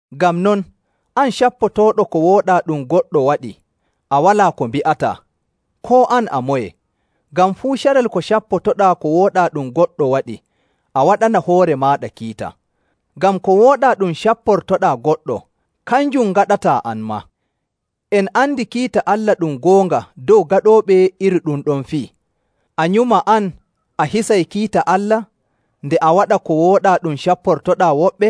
Ngam non, an, cappotooɗo ko wooɗaa ɗum goɗɗo waɗi, a walaa ko mbi'ataa, koo an a moye. Ngam fuu carel ko cappotoɗaa ko wooɗaa ɗum goɗɗo waɗi, a waɗana hoore maaɗa kiita. Ngam ko wooɗaa ɗum capportoɗaa goɗɗo, kanjum ngaɗataa an maa.. En andi kiita Allah ɗum goonga dow gaɗooɓe iri ɗum ɗon fii. A nyuma an, a hisay kiita Allah, nde a waɗa ko wooɗaa ɗum capportoɗaa woɓɓe?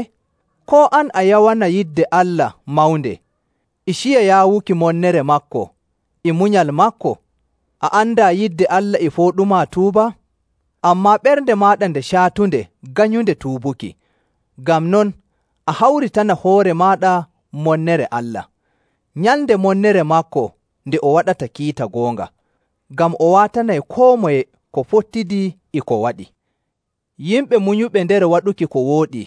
Koo an a yawana yidde Allah mawnde, e ciya yaawuki monnere maako, e munyal maako? A andaa yidde Allah e fooɗumaa tuubaa? Ammaa ɓernde maaɗa nde caatunde ganyunde tuubuki. Ngam non, a hawritana hoore maaɗa monnere Allah, Nyalnde monnere maako nde o waɗata kiita goonga. Ngam o waatanay koo moye ko fottidi e ko waɗi.. Yimɓe munyuɓe nder waɗuki ko wooɗi,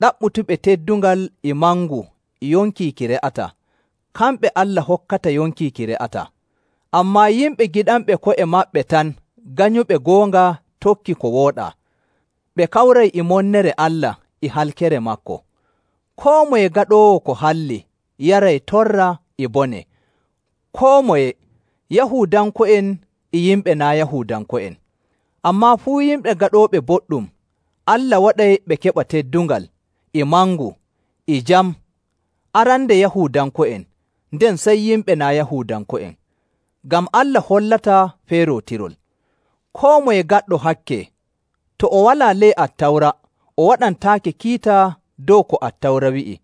ɗaɓɓutuɓe teddungal e mangu e yonki ki re'ataa, kamɓe Allah hokkata yonki ki re'ataa. Ammaa yimɓe giɗanɓe ko'e maɓɓe tan ganyuɓe goonga tokki ko wooɗaa, ɓe kawray e monnere Allah e halkere maako. Koo moye gaɗoowo ko halli yaray torra e bone, koo moye, Yahuudanko'en e yimɓe naa' Yahuudanko'en. Ammaa fuu yimɓe gaɗooɓe boɗɗum, Allah waɗay ɓe keɓa teddungal, e mangu, e jam; arande Yahuudanko'en, nden sey yimɓe naa' Yahuudanko'en, ngam Allah hollataa feerootirol.. Koo moye gaɗɗo hakke, to o walaa ley Attawra, o waɗantaake kiita dow ko Attawra wi'i.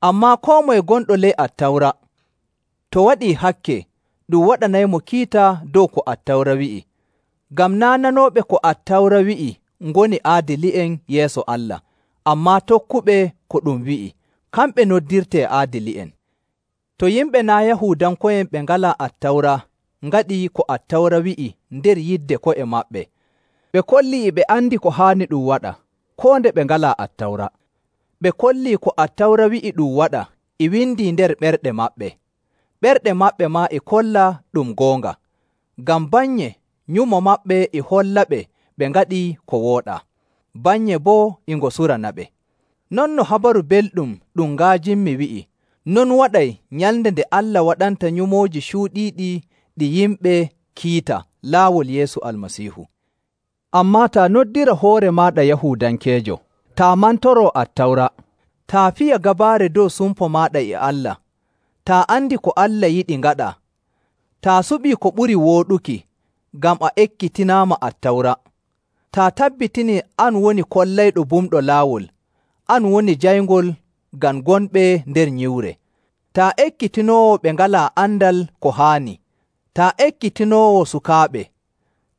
Ammaa koo moye gonɗo ley Attawra, to waɗii hakke, ɗum waɗanaymo kiita dow ko Attawra wi'i. Ngam naa' nanooɓe ko Attawra wi'i ngoni aadili'en yeeso Allah, ammaa tokkuɓe ko ɗum wi'i, kamɓe noddirtee aadili'en. To yimɓe naa' Yahuudanko'en ɓe ngalaa Attawra ngaɗii ko Attawra wi'i nder yidde ko'e maɓɓe, ɓe kollii e ɓe andi ko haani ɗum waɗa, koo nde ɓe ngalaa Attawra. Ɓe kollii ko Attawra wi'i ɗum waɗa e windii nder ɓerɗe maɓɓe. Ɓerɗe maɓɓe maa e kolla ɗum goonga, ngam bannye nyumo maɓɓe e hollaɓe ɓe ngaɗii ko wooɗaa, bannye boo e ngo suranaɓe. Non no Habaru Belɗum ɗum nga'ajinmi wi'i, non waɗay Nyalnde nde Allah waɗanta nyumooji cuuɗiiɗi ɗi yimɓe kiita laawol Yeesu Almasiihu. Ammaa taa noddira hoore maaɗa Yahuudankeejo, taa mantoroo Attawra, taa fiya gabaare dow sumpo maaɗa e Allah, taa andi ko Allah yiɗi ngaɗaa, taa suɓii ko ɓuri wooɗuki ngam a ekkitinaama Attawra, taa tabbitinii an woni kollayɗo bumɗo laawol, an woni jayngol ngam gonɓe nder nyiwre, taa ekkitinoowo ɓe ngalaa andal ko haani, taa ekkitinoowo sukaaɓe,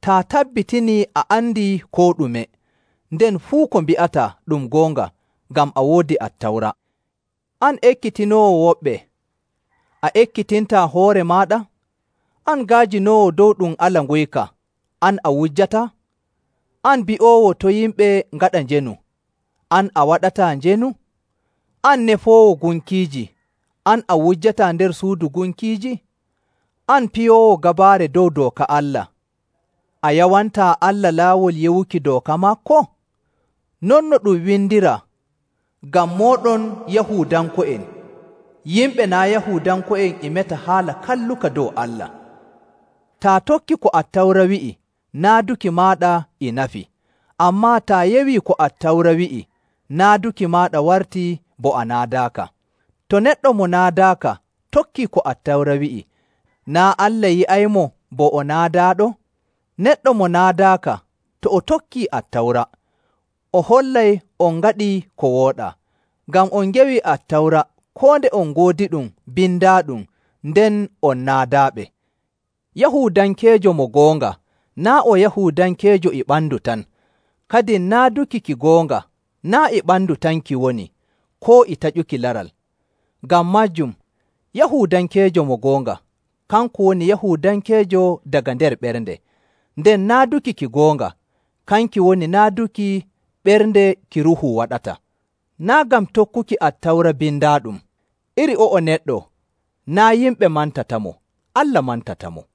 taa tabbitinii a andi koo ɗume, nden fuu ko mbi'ataa ɗum goonga ngam a woodi Attawra — an ekkitinoowo woɓɓe, a ekkitintaa hoore maaɗa? An nga'ajinoowo dow ɗum ala nguyka, an a wujjataa? An bi'oowo to' yimɓe ngaɗa njeenu, an a waɗataa njeenu? An nefoowo gunkiiji, an a wujjataa nder suudu gunkiiji? An piyoowo gabaare dow dooka Allah, a yawantaa Allah laawol yewuki dooka maako? Non no ɗum windiraa, “Ngam mooɗon Yahuudanko'en, yimɓe naa' Yahuudanko'en e meta haala kalluka dow Allah.”. Taa tokkii ko Attawra wi'i, naaduki maaɗa e nafi. Ammaa taa yewii ko Attawra wi'i, naaduki maaɗa wartii bo a naadaaka. To neɗɗo mo naadaaka tokkii ko Attawra wi'i, naa' Allah yi'aymo bo o naadaaɗo? Neɗɗo mo naadaaka, to o tokkii Attawra, o hollay on ngaɗii ko wooɗaa, ngam on ngewi Attawra koo nde on ngoodiɗum bindaaɗum nden on naadaaɓe. Yahuudankeejo mo goonga naa' o Yahuudankeejo e ɓandu tan, kadin naaduki ki goonga naa' e ɓandu tan ki woni, koo e taƴuki laral. Ngam maajum, Yahuudankeejo mo goonga, kanko woni Yahuudankeejo daga nder ɓernde, nden naaduki ki goonga, kanki woni naaduki ɓernde ki Ruuhu waɗata, naa' ngam tokkuki Attawra bindaaɗum. Iri o'o neɗɗo naa' yimɓe mantatamo, Allah mantatamo..